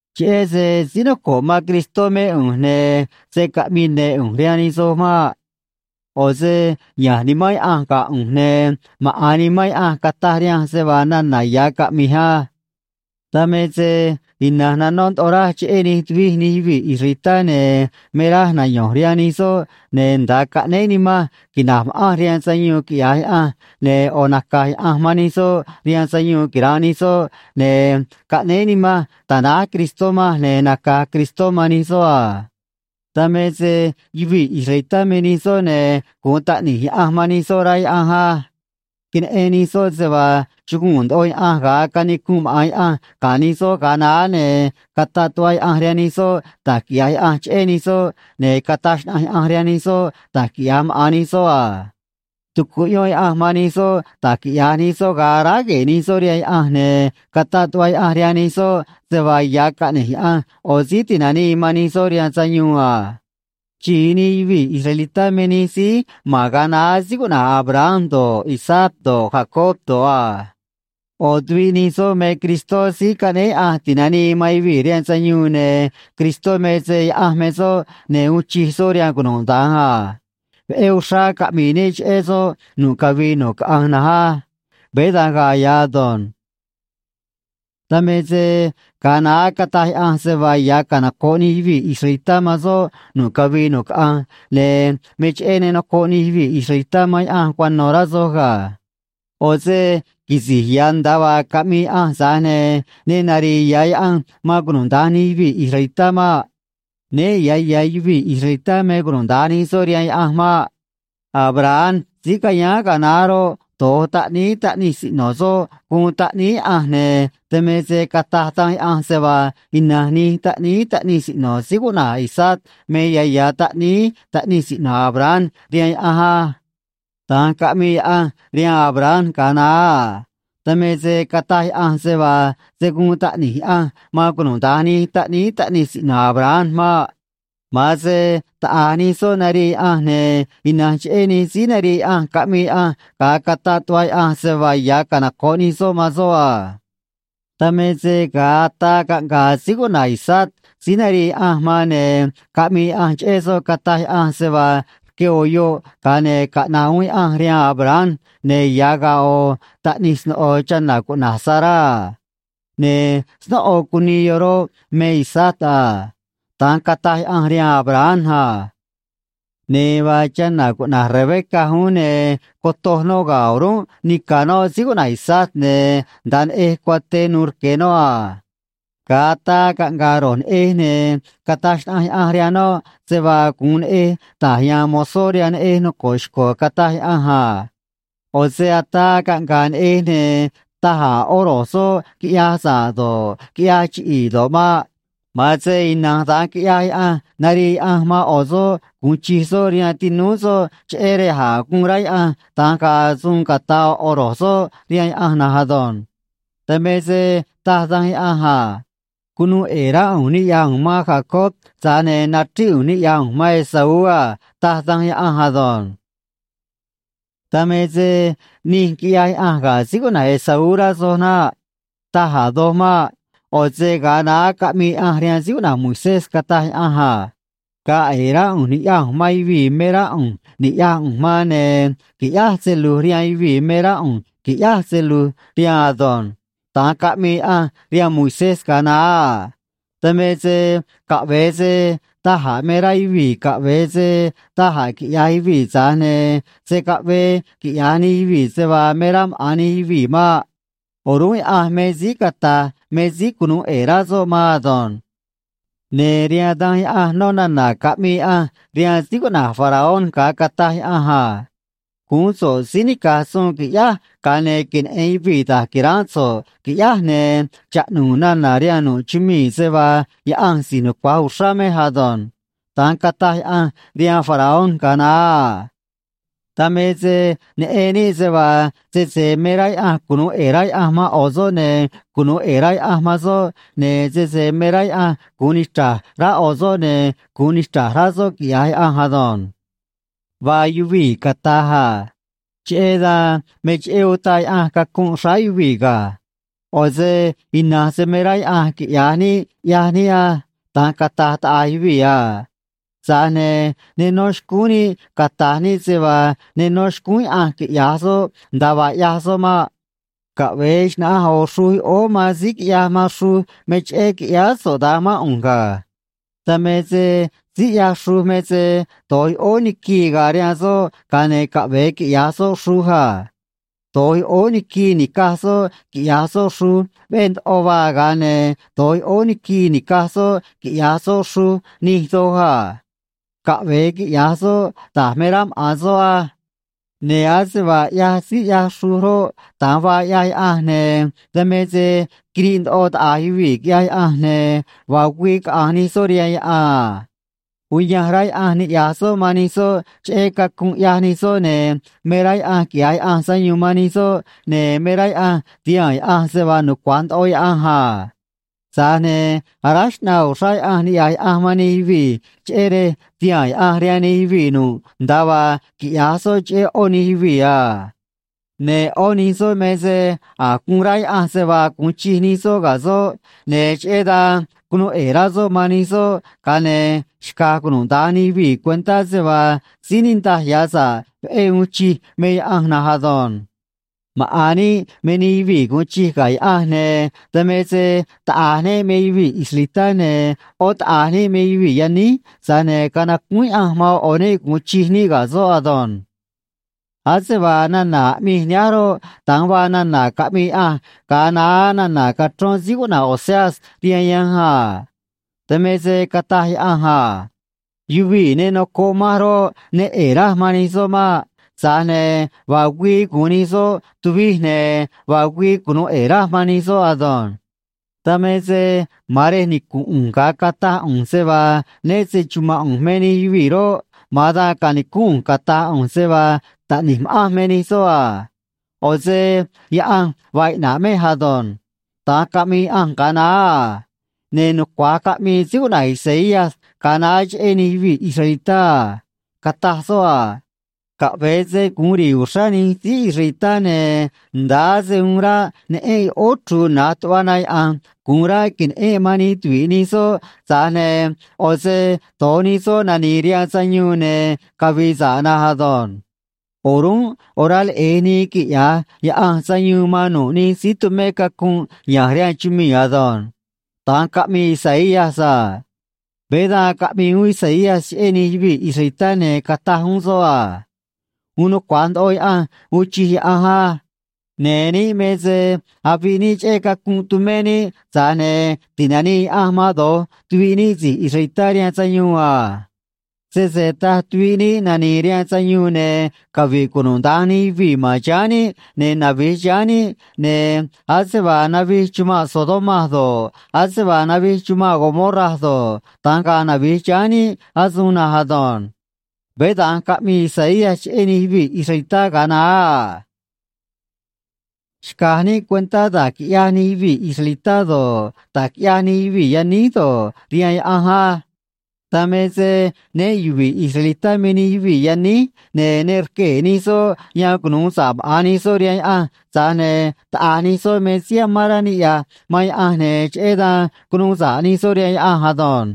Cheꞌé se síí noco̱ꞌ man Cristó mé ꞌu̱nj, ne̱ se̱ caꞌmii ne̱ ꞌu̱nj rihaan nij soj maꞌ. ꞌO̱ se ya̱nj Nimán Yaꞌanj ga̱ ꞌu̱nj, ne̱ maꞌa̱n Nimán Yaꞌanj cataj rihanj se vaa nana̱ ya̱ caꞌmij á. Dan me se ina̱nj nanó ndoꞌo raj cheꞌé nij tuvij nij yuvii̱ israelitá, ne̱ me raj nayo̱nj rihaan nij soꞌ, ne̱ nda̱a caꞌnéé nimanj quina̱j ma̱ꞌanj rihaan sayuun, quiꞌya̱j Yaꞌanj, ne̱ ꞌo̱ naca̱j Yaꞌanj man nij soꞌ rihaan sayuun quira̱nꞌ nij soꞌ, ne̱ caꞌnéé nimanj ta̱náj Cristó manj, ne̱ naca̱j Cristó man nij soꞌ a. Dan me se yuvii̱ israelitá me nij soꞌ, ne̱ gu̱un taꞌni̱j Yaꞌanj man nij soꞌ, rá Yaꞌanj á. Queneꞌen nij soꞌ se vaa chuguu̱n ndoꞌo Yaꞌanj ga̱a canicunꞌ maꞌa̱n Yaꞌanj ga̱ nij soꞌ ga̱a naá, ne̱ cataꞌ tuꞌva Yaꞌanj rihaan nij soꞌ da̱j quiꞌya̱j Yaꞌanj cheꞌé nij soꞌ, ne̱ cataj xnaꞌanj Yaꞌanj rihaan nij soꞌ da̱j quiꞌya̱j maꞌa̱n nij soꞌ a. Tucuꞌyón Yaꞌanj man nij soꞌ da̱j quiꞌya̱j nij soꞌ ga̱a aráj gue̱e̱ nij soꞌ rihaan Yaꞌanj, ne̱ cataꞌ tuꞌva Yaꞌanj rihaan nij soꞌ se vaa ya̱ caꞌne̱j Yaꞌanj ꞌo̱ síí ti̱nanii man nij soꞌ rihaan sayuun a. Xi̱i nij yuvii̱ israelitá me nij síí ma̱n ga̱a naá síí cuꞌna̱j Abraham do̱ꞌ, Isaac do̱ꞌ, Jacob do̱ꞌ a. ꞌO̱ tuviꞌ nij soꞌ me Cristó Síí Caꞌnéé Yaꞌanj Ti̱nanii man Yuvii̱ rihaan Sayuun, ne̱ Cristó me se Yaꞌanj me soꞌ, ne̱ uun chij soꞌ rihaan cunuda̱nj a. Veꞌé uxrá caꞌmi̱i̱ níꞌ cheꞌé soꞌ nu̱ꞌ cavii nu̱ꞌ caꞌanj na̱nj á. Veé da̱nj ga̱a̱ ya̱ ado̱nj. Dan me se ga̱a naá cataj Yaꞌanj se vaa ya̱ canoco̱ꞌ nij yuvii̱ israelitá man soꞌ nu̱ꞌ cavii nu̱ꞌ caꞌanj, ne̱ me cheꞌé ne nocoꞌ nij yuvii̱ israelitá man Yaꞌanj cuano̱, rá soj ga̱. ꞌO̱ se quisi̱j ya̱ nda̱a vaa caꞌmii Yaꞌanj, tza̱j ne̱ ne nari̱i̱ ya̱ Yaꞌanj man cunuda̱nj nij yuvii̱ israelitá maꞌ. Né ya̱ ya̱ yuvii̱ israelitá me cunuda̱nj nij soꞌ rihaan Yaꞌanj maꞌ. Abraham síí cayáán ga̱a naá roꞌ, do̱j taꞌníí taꞌnij siꞌno̱ soꞌ guun taꞌníí Yaꞌanj, ne̱ dan me se cataj Danj Yaꞌanj se vaa ina̱nj nij taꞌníí taꞌnij siꞌno̱ síí cuꞌna̱j Isaac me ya̱ ya̱ taꞌníí taꞌnij siꞌno̱ Abraham rihaan Yaꞌanj á. Da̱nj caꞌmii Yaꞌanj rihaan Abraham ga̱a naá a. Dan me se cataj Yaꞌanj se vaa se̱ guun taꞌni̱j Yaꞌanj man cunuda̱nj nij taꞌníí taꞌnij siꞌno̱ Abraham maꞌ. Ma̱an se taꞌa̱j nij soꞌ narii Yaꞌanj, ne̱ ina̱nj cheꞌé nij síí narii Yaꞌanj caꞌmii Yaꞌanj, ga̱a cataꞌ tuꞌva Yaꞌanj se vaa ya̱ canoco̱ꞌ nij soꞌ man soꞌ a. Dan me se ga̱a ataa caꞌnga̱a̱ síí cuꞌna̱j Isaac síí narii Yaꞌanj man, ne̱ caꞌmii Yaꞌanj cheꞌé soꞌ, cataj Yaꞌanj se vaa rque ꞌo̱ yoꞌ, ga̱a ne̱ caꞌna̱ꞌ uún Yaꞌanj rihaan Abraham, ne̱ ya̱ ga̱a̱ ꞌo̱ taꞌnij sno̱ꞌo chana̱ cuꞌna̱j Sará a. Ne̱ snóꞌo cunii yoꞌ roꞌ, me Isaac a. Da̱nj cataj Yaꞌanj rihaan Abraham a. Ne̱ vaa chana̱ cuꞌna̱j Rebeca uún, ne̱ cotoj noꞌ ga̱ o̱rúnꞌ nica̱ noꞌ síí cuꞌna̱j Isaac, ne̱ nda̱a neꞌej cuaté nu̱u̱ rque noꞌ a. Ga̱a ataa caꞌnga̱a̱ ro̱j neꞌej, ne̱ cataj xnaꞌanj Yaꞌanj rihaan noꞌ se vaa gu̱un neꞌej ta̱j ya̱a̱n mozó rihaan neꞌej noco̱ꞌ xco̱, cataj Yaꞌanj a. ꞌO̱ se ataa caꞌnga̱a̱ neꞌej, ne̱ taj a̱ ꞌó ro̱j soꞌ quiꞌyaj sa̱ꞌ do̱ꞌ, quiꞌyaj chiꞌi̱i̱ do̱ꞌ maꞌ. Ma̱an se ina̱nj da̱nj quiꞌyaj Yaꞌanj narii Yaꞌanj man ꞌo̱ soꞌ gu̱un chij soꞌ rihaan tinúú soꞌ, cheꞌé rej a̱j guun rá Yaꞌanj da̱nj ga̱a̱ suun ca̱ta̱ ꞌo̱ ꞌo̱ soꞌ rihaan Yaꞌanj na̱nj ado̱nj. Dan me se taj Danj Yaꞌanj a: “Cunuu ꞌe̱e̱ rá ꞌu̱nj niꞌya̱j ꞌu̱nj man Jacob, tza̱j ne̱ nachríꞌ ꞌu̱nj niꞌya̱j ꞌu̱nj man Esaú a”, taj Danj Yaꞌanj ado̱nj. Dan me se nij quiꞌyaj Yaꞌanj ga̱ síí cuꞌna̱j Esaú, rá soj naꞌ. Taj a̱ doj maꞌ. ꞌO̱ se ga̱a naá caꞌmii Yaꞌanj rihaan síí cuꞌna̱j Moisés, cataj Yaꞌanj a: “Ga̱a̱ ꞌe̱e̱ rá ꞌu̱nj ni̱ꞌyaj ꞌu̱nj man yuvii̱ me rá ꞌu̱nj niꞌya̱j ꞌu̱nj man, ne̱ qui̱ꞌyáj se lu̱j rihaan yuvii̱ me rá ꞌu̱nj qui̱ꞌyáj se lu̱j rihaan ado̱nj.” Da̱nj caꞌmii Yaꞌanj rihaan Moisés ga̱a naá a. Dan me se caꞌve̱e se da̱j a̱ me rá yuvii̱, caꞌve̱e se da̱j a̱ quiꞌya̱j yuvii̱, tza̱j ne̱ se̱ caꞌvee quiꞌya̱j nij yuvii̱ se vaa me rá maꞌa̱n nij yuvii̱ maꞌ. O̱rúnꞌ Yaꞌanj me síí cata̱j me síí cunu̱u ꞌe̱e̱ rá soꞌ maan ado̱nj. Ne̱ rihaan Danj Yaꞌanj nó nana̱ caꞌmii Yaꞌanj rihaan síí cuꞌna̱j Faraón ga̱a cataj Yaꞌanj a: “Guún so̱ꞌ síí nica̱j suun, quiꞌyáj, ga̱a ne̱ queneꞌe̱n yuvii̱ da̱j qui̱ránꞌ so̱ꞌ, qui̱ꞌyáj, ne̱ chaꞌnu̱u̱ nana̱ rihaan nu̱ꞌ chumii̱ se vaa Yaꞌanj si̱j nucua̱j uxrá mej ado̱nj.” Da̱nj cataj Yaꞌanj rihaan Faraón ga̱a naá a. Dan me se neꞌen níꞌ se vaa sese me rá Yaꞌanj cunu̱u ꞌe̱e̱ rá Yaꞌanj man ꞌo̱ soꞌ, ne̱ cunu̱u ꞌe̱e̱ rá Yaꞌanj man soꞌ, ne̱ sese me rá Yaꞌanj gu̱un nichra̱j rá ꞌo̱ soꞌ, ne̱ gu̱un nichra̱j rá soꞌ, quiꞌya̱j Yaꞌanj ado̱nj. Vaa yuvii̱ cata̱j a: “Cheꞌé dan, me cheꞌé utaꞌ Yaꞌanj cacunꞌ xráá yuvii̱ ga̱. ꞌO̱ se ina̱nj se me rá Yaꞌanj quiꞌya̱j níꞌ ꞌyaj níꞌ á.” Da̱nj cata̱j taꞌa̱j yuvii̱ a. Tza̱j ne̱ ne nó xcúún níꞌ cata̱j níꞌ se vaa ne nó xcúún Yaꞌanj quiꞌya̱j soꞌ nda̱a vaa ꞌyaj soꞌ maꞌ. Caꞌve̱e xna̱ꞌanj ꞌo̱ xruj yoꞌóó man síí quiꞌyaj man xruj: “Me cheꞌé quiꞌyáá so̱ꞌ da̱nj mán ꞌu̱nj ga̱.” Dan me se síí ꞌyaj xruj me se do̱j yoꞌóó niquii ga̱a̱ rihaan soꞌ, ga̱a ne̱ caꞌve̱e quiꞌya̱j soꞌ xruj a. Do̱j yoꞌóó niquii ni̱caj soꞌ quiꞌya̱j soꞌ xruj veꞌé ndoꞌo vaa, ga̱a ne̱ doj yoꞌóó niquii ni̱caj soꞌ quiꞌya̱j soꞌ xruj nij doj a. Caꞌve̱e quiꞌya̱j soꞌ da̱j me rá maꞌa̱n soꞌ á. Ne̱ ase vaa ꞌyaj síí ꞌyaj xruj roꞌ, da̱nj vaa ꞌyaj Yaꞌanj, ne̱ dan me se quiriꞌ ndoꞌo taꞌa̱j yuvii̱ quiꞌyaj Yaꞌanj, ne̱ vaa güii caꞌa̱nj nij soꞌ rihaan yaꞌan a. Uyanj rá Yaꞌanj niꞌya̱j soꞌ man nij soꞌ cheꞌé cacunꞌ ꞌyaj nij soꞌ, ne̱ me rá Yaꞌanj quiꞌya̱j Yaꞌanj sayuun man nij soꞌ, ne̱ me rá Yaꞌanj ti̱haa̱n Yaꞌanj se vaa nucua̱j ndoꞌo Yaꞌanj a. Tza̱j ne̱ aráj xꞌnaa uxrá Yaꞌanj niꞌya̱j Yaꞌanj man nij yuvii̱, cheꞌé rej ti̱haa̱n Yaꞌanj rihaan nij yuvii̱ nu̱ꞌ nda̱a vaa quiꞌya̱j soꞌ cheꞌé ꞌó nij yuvii̱ a. Ne̱ ꞌó nij soꞌ me se a̱j guun rá Yaꞌanj se vaa gu̱un chij nij soꞌ ga̱ soꞌ, ne̱ cheꞌé dan cunu̱u ꞌe̱e̱ rá soꞌ man nij soꞌ, ga̱a ne̱ xca̱j cunuda̱nj nij yuvii̱ cuentá se vaa síí niꞌndaj ya̱ sa̱ꞌ veꞌé uun chij me Yaꞌanj na̱nj ado̱nj. Maꞌa̱n níꞌ me nij yuvii̱ gu̱un chij ga̱ Yaꞌanj, ne̱ dan me se taꞌa̱j níꞌ me yuvii̱ israelitá, ne̱ ꞌó taꞌa̱j níꞌ me yuvii̱ yaníj, tza̱j ne̱ canacúún Yaꞌanj man ꞌo̱ ꞌo̱ níꞌ gu̱un chij níꞌ ga̱ soꞌ ado̱nj. Ase vaa nana̱ aꞌmij nihánj roꞌ, da̱nj vaa nana̱ caꞌmii Yaꞌanj ga̱a naá nana̱ cachrón síí cuꞌna̱j Oseas rihaan yanj a. Dan me se cataj Yaꞌanj a: Yuvii̱ ne nocoꞌ manj roꞌ, ne ꞌe̱e̱ raj man nij soꞌ maꞌ. Tza̱j ne̱ vaa güii gu̱un nij soꞌ tuvij, ne̱ vaa güii cunu̱u ꞌe̱e̱ raj man nij soꞌ ado̱nj. Dan me se ma̱an rej nicu̱nꞌ ꞌu̱nj ga̱a cataj ꞌu̱nj se vaa né se‑chuma̱nꞌ ꞌu̱nj me nij yuvii̱ roꞌ, ma̱an dan ca̱nicúnꞌ ꞌu̱nj cata̱j ꞌu̱nj se vaa taꞌni̱j ma̱ꞌanj me nij soꞌ a. ꞌO̱ se Yaꞌanj vaa iꞌna̱ꞌ mej ado̱nj. Da̱nj caꞌmii Yaꞌanj ga̱a naá a. Ne̱ nucua̱j caꞌmii síí cuꞌna̱j Isaías ga̱a naá cheꞌé nij yuvii̱ israelitá a. Cataj soꞌ a: Caꞌve̱e se gu̱un ri̱i̱ uxrá nij síí israelitá, ne̱ nda̱a ase uun ráꞌ neꞌénꞌ yoꞌóó chru̱u̱ na̱j tuꞌva na yaꞌa̱nj gu̱un ráꞌ que̱neꞌénꞌ man nij tuvi̱ꞌ nij soꞌ, tza̱j ne̱ ꞌo̱ se do̱j nij soꞌ nani̱i̱ rihaan sayuun ne̱ cavi̱i̱ sa̱ꞌ na̱nj ado̱nj. O̱rúnꞌ orá leꞌe̱j nii quiꞌya̱j Yaꞌanj sayuun man nu̱ꞌ nij síí tumé cacunꞌ ya̱nj rihaan chumii̱ ado̱nj. Da̱nj caꞌmii Isaías a. Veé dan caꞌmii uún Isaías cheꞌé nij yuvii̱ israelitá, ne̱ cataj uún soꞌ a: Uun nucua̱j ndoꞌo Yaꞌanj uun chij Yaꞌanj á. Ne̱ níꞌ me se aviꞌ níꞌ cheꞌé cacunꞌ tumé níꞌ, tza̱j ne̱ ti̱nanii Yaꞌanj man do̱j tuviꞌ níꞌ si̱j israelitá rihaan sayuun a. Sese taj tuviꞌ níꞌ nani̱i̱ rihaan sayuun, ne̱ cavi̱ꞌ cunuda̱nj nij yuvii̱ ma̱n chiháán níꞌ, ne̱ navi̱j chiháán níꞌ, ne̱ ase vaa navij chumanꞌ Sodoma do̱ꞌ, ase vaa navij chumanꞌ Gomorra do̱ꞌ, da̱nj ga̱a̱ navi̱j chiháán níꞌ asuun na̱nj ado̱nj. Veé da̱nj caꞌmii Isaías cheꞌé nij yuvii̱ israelitá ga̱a naá a. Xca̱j níꞌ cuentá da̱j quiꞌyaj nij yuvii̱ israelitá do̱ꞌ, da̱j quiꞌyaj nij yuvii̱ yaníj do̱ꞌ, rihaan Yaꞌanj á. Dan me se né yuvi̱i̱ israelitá me nij yuvii̱ yaníj, ne̱ ne rquee̱ nij soꞌ yan cunu̱u sa̱ꞌ maꞌa̱n nij soꞌ rihaan Yaꞌanj, tza̱j ne̱ taꞌa̱j nij soꞌ me síí amán rá niꞌya̱j man Yaꞌanj, ne̱ cheꞌé dan cunuu sa̱ꞌ nij soꞌ rihaan Yaꞌanj ado̱nj.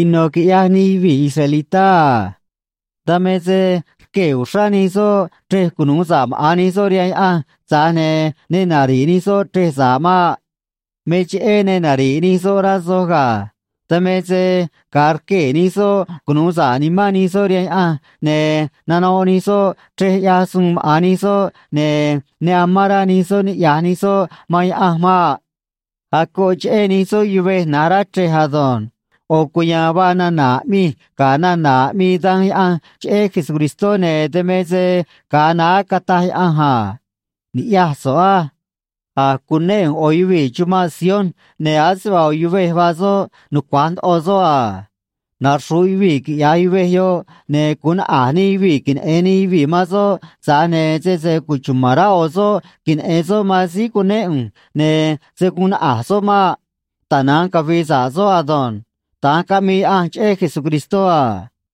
Ino̱ quiꞌyaj nij yuvii̱ israelitá a. Dan me se rquee̱ uxrá nij soꞌ chrej cunu̱u sa̱ꞌ maꞌa̱n nij soꞌ rihaan Yaꞌanj, tza̱j ne̱ ne nari̱ꞌ nij soꞌ chrej sa̱ꞌ maꞌ. Me cheꞌé ne nari̱ꞌ nij soꞌ, rá soj ga̱. Dan me se ga̱a rquee̱ nij soꞌ cunu̱u sa̱ꞌ nimán nij soꞌ rihaan Yaꞌanj, ne̱ nanoꞌ nij soꞌ chrej ꞌyaj suun maꞌa̱n nij soꞌ, ne̱ ne amán rá nij soꞌ niꞌya̱j nij soꞌ man Yaꞌanj maꞌ. Acoꞌ cheꞌé nij soꞌ yuvej na̱j rá chrej ado̱nj. ꞌO̱ cuya̱a̱n vaa nana̱ aꞌmij ga̱ nana̱ aꞌmii Danj Yaꞌanj cheꞌé Jesucristó, ne̱ dan me se ga̱a naá cataj Yaꞌanj a: Ni̱ꞌyaj so̱ꞌ á. A̱j cunéꞌ ꞌu̱nj ꞌo̱ yuvii̱ chumanꞌ Sion, ne̱ ase vaa ꞌo̱ yuvej vaa soꞌ, nucua̱j ndoꞌo soꞌ a. Naxru̱ꞌ yuvii̱, quiꞌya̱j yuvej yoꞌ, ne̱ gu̱un naꞌa̱j nij yuvii̱ queneꞌe̱n nij yuvii̱ man soꞌ, tza̱j ne̱ sese cuchuma̱n rá ꞌo̱ soꞌ queneꞌe̱n soꞌ man síí cunéꞌ ꞌu̱nj, ne̱ se̱ guun naꞌa̱j soꞌ maꞌ. Tana̱nj cavi̱i̱ sa̱ꞌ soꞌ ado̱nj. Da̱nj caꞌmii Yaꞌanj cheꞌé Jesucristó a.